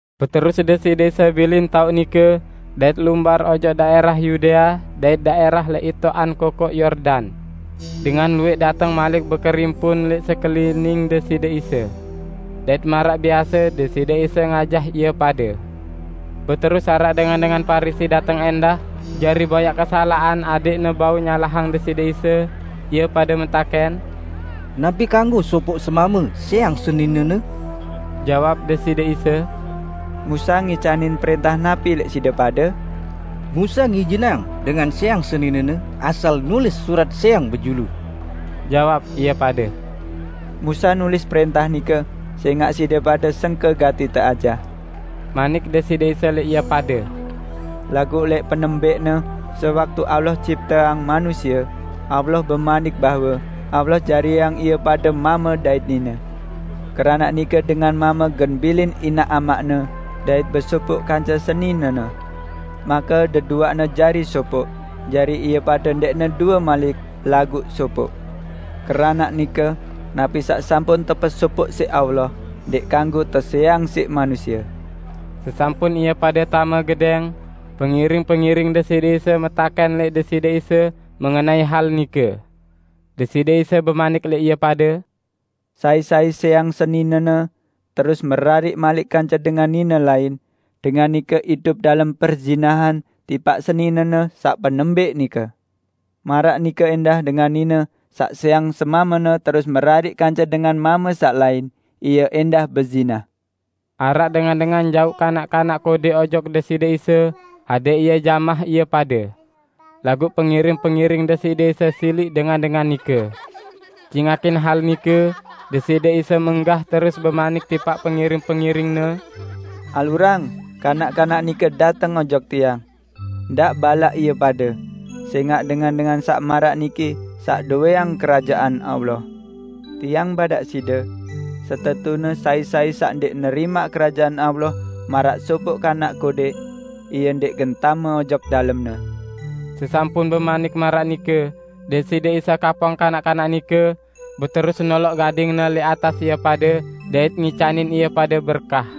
Beterus Deside Isa bilin taoq nike, dait lumbar ojok daẽrah Yudea dait daẽrah lẽq itoqan Kokoq Yordan. Dengan luwẽq dateng malik bekerimpun lẽq sekelining Deside Isa. Dait maraq biase Deside Isa ngajah ie pade. Beterus araq dengan-dengan Parisi dateng ẽndah jari boyaq kesalaqan adẽqne bau nyalahang Deside Isa, ie pade metakẽn, "Napi kanggo sopoq semame sẽang seninene?" Jawab Deside Isa, "Musa ngicanin prẽntah napi lẽq side pade?" "Musa ngijinang dengan sẽang seninene asal nulis surat sẽang bejulu," jawab ie pade. "Musa nulis prẽntah nike sẽngaq side pade sengke gati teajah," manik Deside Isa lẽq ie pade. "Laguq lẽq penembẽqne, sewaktu Allah cipteang manusie, Allah bemanik bahwe 'Allah jariang ie pade mame dait nine. Keranaq nike dengan mame gen bilin inaq amaqne dait besopoq kance seninene, make deduaqne jari sopoq.' Jari ie pade ndẽqne due malik, laguq sopoq. Keranaq nike, napi saq sampun tepesopoq siq Allah, ndẽq kanggo tesẽang siq manusie!" Sesampun ie pade tame gedẽng, pengiring-pengiring Deside Isa metakẽn lẽq Deside Isa mengenai hal nike. Deside Isa bemanik lẽq ie pade, "Sai-sai sẽang seninene, terus merariq malik kance dengan nine lain, dengan nike idup dalem perzinahan tipaq seninene saq penembẽq nike. Maraq nike ẽndah dengan nine saq sẽang semamene terus merariq kance dengan mame saq lain, ie ẽndah bezinah." Araq dengan-dengan jauq kanak-kanak kodẽk ojok Deside Isa adẽq Ie jamah ie pade. Laguq pengiring-pengiring Deside Isa siliq dengan-dengan nike. Cingakin hal nike, Deside Isa menggah terus bemanik tipaq pengiring-pengiring-Ne, "Alurang kanak-kanak nike dateng ojok Tiang! Ndaq balaq ie pade, sẽngaq dengan-dengan saq maraq niki saq dowẽang Kerajaan Allah. Tiang badaq side! Setetune sai-sai saq ndẽq nerimaq Kerajaan Allah maraq sopoq kanak kodẽq, ie ndẽq gen tame ojok dalemne." Sesampun bemanik maraq nike, Deside Isa kapong kanak-kanak nike, beterus noloq gading-Ne lẽq atas ie pade dait ngicanin ie pade berkah.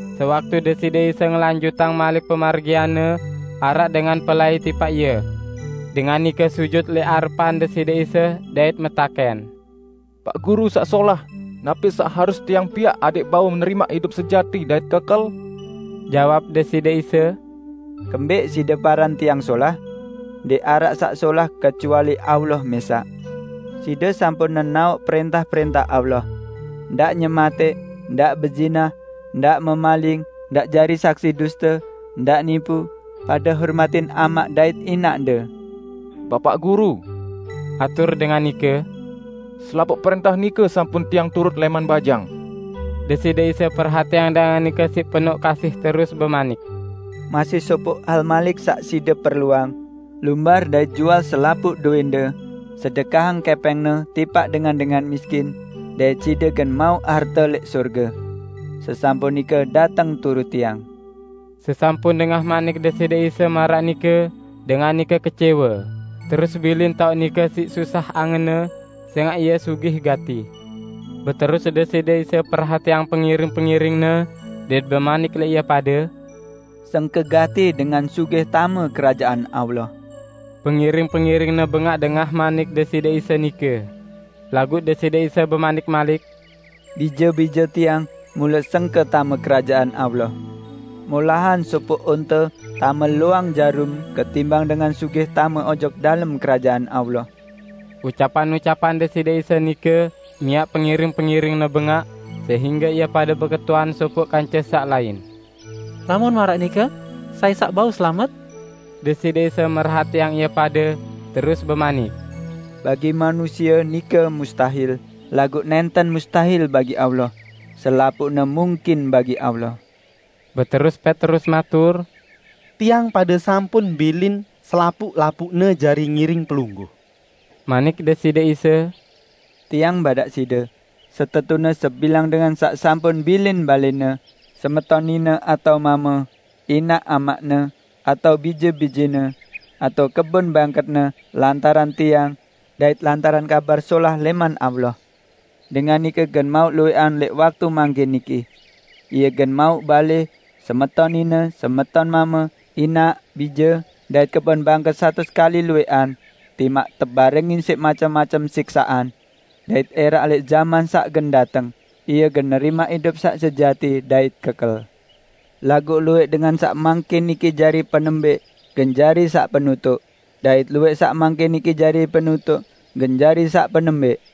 Sewaktu Deside Isa ngelanjutang malik pemargian-Ne, araq dengan pelai tipaq Ie. Dengan nike sujut lẽq arepan Deside Isa dait metakẽn, "Paq Guru saq solah, napi saq harus tiang piaq adẽq bau nerimaq idup sejati dait kekel?" Jawab Deside Isa, "Kembẽq side paran Tiang solah? Ndẽq araq saq solah kecuali Allah mẽsaq. Side sampun nenaoq prẽntah-prẽntah Allah, 'Ndaq nyematẽq; ndaq bezinah; ndaq memaling; ndaq jari saksi duste; ndaq nipu; pade hormatin amaq dait inaqde.' " "Bapaq Guru," atur dengan nike, "selapuq prẽntah nike sampun tiang turut lẽman bajang." Deside Isa perhatiang dengan nike siq penoq kasih terus bemanik, "Masih sopoq hal malik saq side perluang. Lumbar dait jual selapuq dowẽnde; sedekahang kẽpẽngne tipaq dengan-dengan miskin, dait side gen mauq harte lẽq sorge. Sesampun nike dateng turut Tiang." Sesampun dengah manik Deside Isa maraq nike, dengan nike kecẽwe, terus bilin taoq nike siq susah angenne, sẽngaq ie sugih gati. Beterus Deside Isa perhatiang pengiring-pengiring-Ne, dait bemanik lẽq ie pade, "Sengke gati dengan sugih tame Kerajaan Allah!" Pengiring-pengiring-Ne bengaq dengah manik Deside Isa nike. Laguq Deside Isa bemanik malik, "Bije-bije Tiang, mule sengke tame Kerajaan Allah! Molahan sopoq onte tame loang jarum ketimbang dengan sugih tame ojok dalem Kerajaan Allah." Ucapan-ucapan Deside Isa nike miaq pengiring-pengiring-Ne bengaq sehingge ie pade beketuan sopoq kance saq lain, "Lamun maraq nike, sai saq bau selamet?" Deside Isa merhatiang ie pade, terus bemanik, "Bagi manusie nike mustahil, laguq nẽnten mustahil bagi Allah; selapuqne mungkin bagi Allah." Beterus Petrus matur, "Tiang pade sampun bilin selapuq-lapuqne jari ngiring Pelungguh." Manik Deside Isa, "Tiang badaq side: setetune sebilang dengan saq sampun bilin balẽne, semeton nine atao mame, inaq amaqne, atao bije-bijene, atao kebon bangketne lantaran Tiang dait lantaran Kabar Solah lẽman Allah, dengan nike gen mauq luwẽqan lẽq waktu mangkin niki. Ie gen mauq balẽ, semeton nine, semeton mame, inaq, bije dait kebon bangket satus kali luwẽqan -- timaq tebarengin siq macem-macem siksaqan. Dait ẽraq lẽq jaman saq gen dateng, ie gen nerimaq idup saq sejati dait kekel. Laguq luwẽq dengan saq mangkin niki jari penembẽq gen Jari saq penutuq, dait luwẽq saq mangkin niki jari penutuq gen jari saq penembẽq."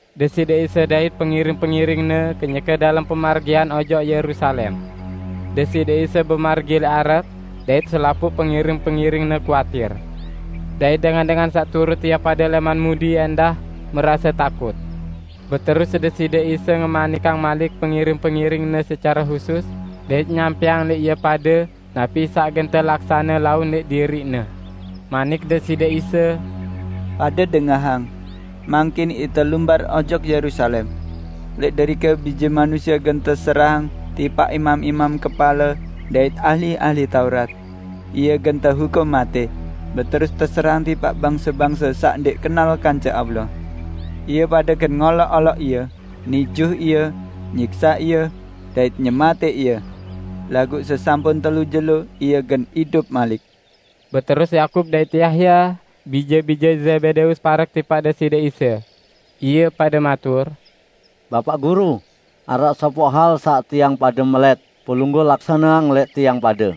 Deside Isa dait pengiring-pengiring-Ne kenyeke dalem pemargian ojok Yerusalem. Deside Isa bemargi lẽq arep, dait selapuq pengiring-pengiring-Ne kuatir. Dait dengan-dengan saq turut ie pade lẽman mudi ẽndah merase takut. Beterus Deside Isa ngemanikang malik pengiring-pengiring-Ne secare husus dait nyampẽang lẽq ie pade napi saq gen telaksane laun lẽq diriq-Ne. Manik Deside Isa, "Pade dengahang. Mangkin ite lumbar ojok Yerusalem. Lẽq derike Bije Manusie gen teserahang tipaq imam-imam kepale dait ahli-ahli Taurat. Ie gen tehukum matẽ, beterus teserahang tipaq bangse-bangse saq ndẽq kenal kance Allah. Ie pade gen ngoloq-oloq Ie, nijuh Ie, nyiksaq Ie, dait nyematẽq Ie. Laguq sesampun telu jelo, Ie gen idup malik." Beterus Yakub dait Yahya, bije-bije Zebedeus parek tipaq Deside Isa, ie pade matur, "Bapaq Guru, araq sopoq hal saq tiang pade melẽt Pelungguh laksaneang lẽq tiang pade."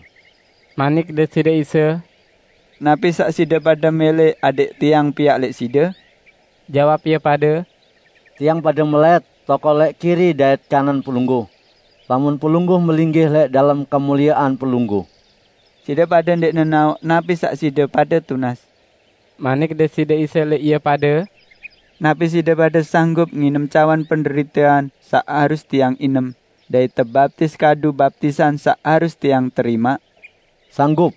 Manik Deside Isa, "Napi saq side pade mẽlẽ adẽq Tiang piaq lẽq side?" Jawab ie pade, "Tiang pade melẽt tokol lẽq kiri dait kanan Pelungguh, lamun Pelungguh melinggih lẽq dalem kemuliean Pelungguh." "Side pade ndẽq nenaoq napi saq side pade tunas," manik Deside Isa lẽq ie pade, "Napi side pade sanggup nginem cawan penderitean saq harus Tiang inem dait tebaptis kadu baptisan saq harus Tiang terimaq?" "Sanggup,"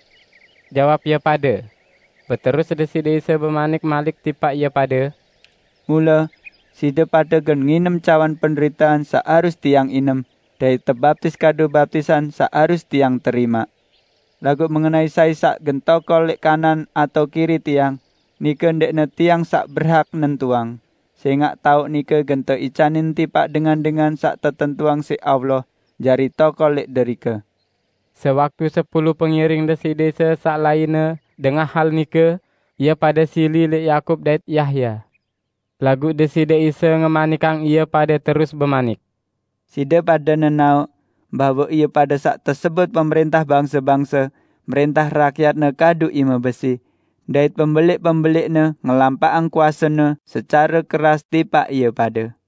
jawab ie pade. Beterus Deside Isa bemanik malik tipaq ie pade, "Mule, side pade gen nginem cawan penderitean saq harus Tiang inem dait tebaptis kadu baptisan saq harus Tiang terimaq. Laguq mengenai sai saq gen tokol lẽq kanan atao kiri Tiang, nike ndẽqne Tiang saq berhak nentuang, sẽngaq taoq nike gen teicanin tipaq dengan-dengan saq tetentuang siq Allah jari tokol lẽq derike." Sewaktu sepulu pengiring Deside Isa saq lainne dengah hal nike, ie pade sili lẽq Yakub dait Yahya. Laguq Deside Isa ngemanikang ie pade terus bemanik: "Side pade nenaoq, bahwe ie pade saq tesebut pemrẽntah bangse-bangse mrẽntah rakyatne kadu ime besi, dait pembelẽq-pembelẽqne ngelampaqang kuasene secare keras tipaq ie pade.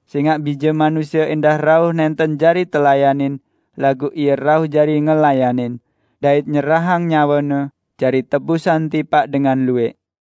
Sẽngaq Bije Manusie ẽndah rauh nẽnten jari telayanin laguq Ie rauh jari ngelayanin, dait nyerahang nyawe-Ne jari tebusan tipaq dengan luwẽq."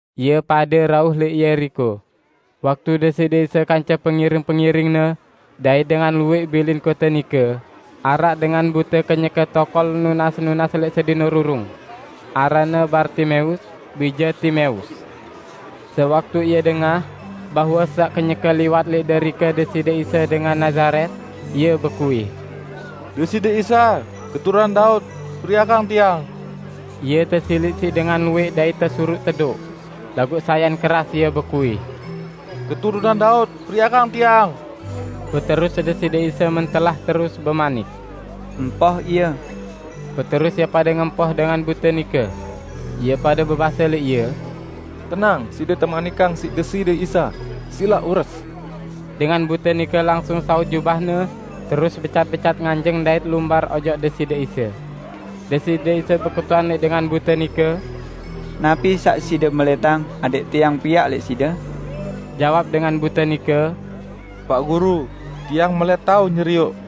Ie pade rauh lẽq Yeriko. Waktu Deside Isa kance pengiring-pengiring-Ne dait dengan luwẽq bilin kote nike, araq dengan bute kenyeke tokol nunas-nunas lẽq sedin rurung. Aranne Bartimeus, bije Timeus. Sewaktu ie dengah bahwe saq kenyeke liwat lẽq derike Deside Isa dengan Nazaret, ie bekuih, "Deside Isa, Keturunan Daud, periakang tiang!" Ie tesiliq siq dengan luwẽq dait tesuruq tedoq. Laguq sayan keras ie bekuih, "Keturunan Daud periakang tiang!" Beterus Deside Isa mentelah terus bemanik, "Empoh ie." Beterus ie pade ngempoh dengan bute nike. Ie pade bebase lẽq ie, "Tenang! Side temanikang siq Deside Isa, silaq ures!" Dengan bute nike langsung saut jubahne, terus becat-becat nganjeng dait lumbar ojok Deside Isa. Deside Isa beketuan lẽq dengan bute nike, "Napi saq side melẽtang adẽq Tiang piaq lẽq side?" Jawab dengan bute nike, "Paq Guru, tiang melẽt tao nyerioq."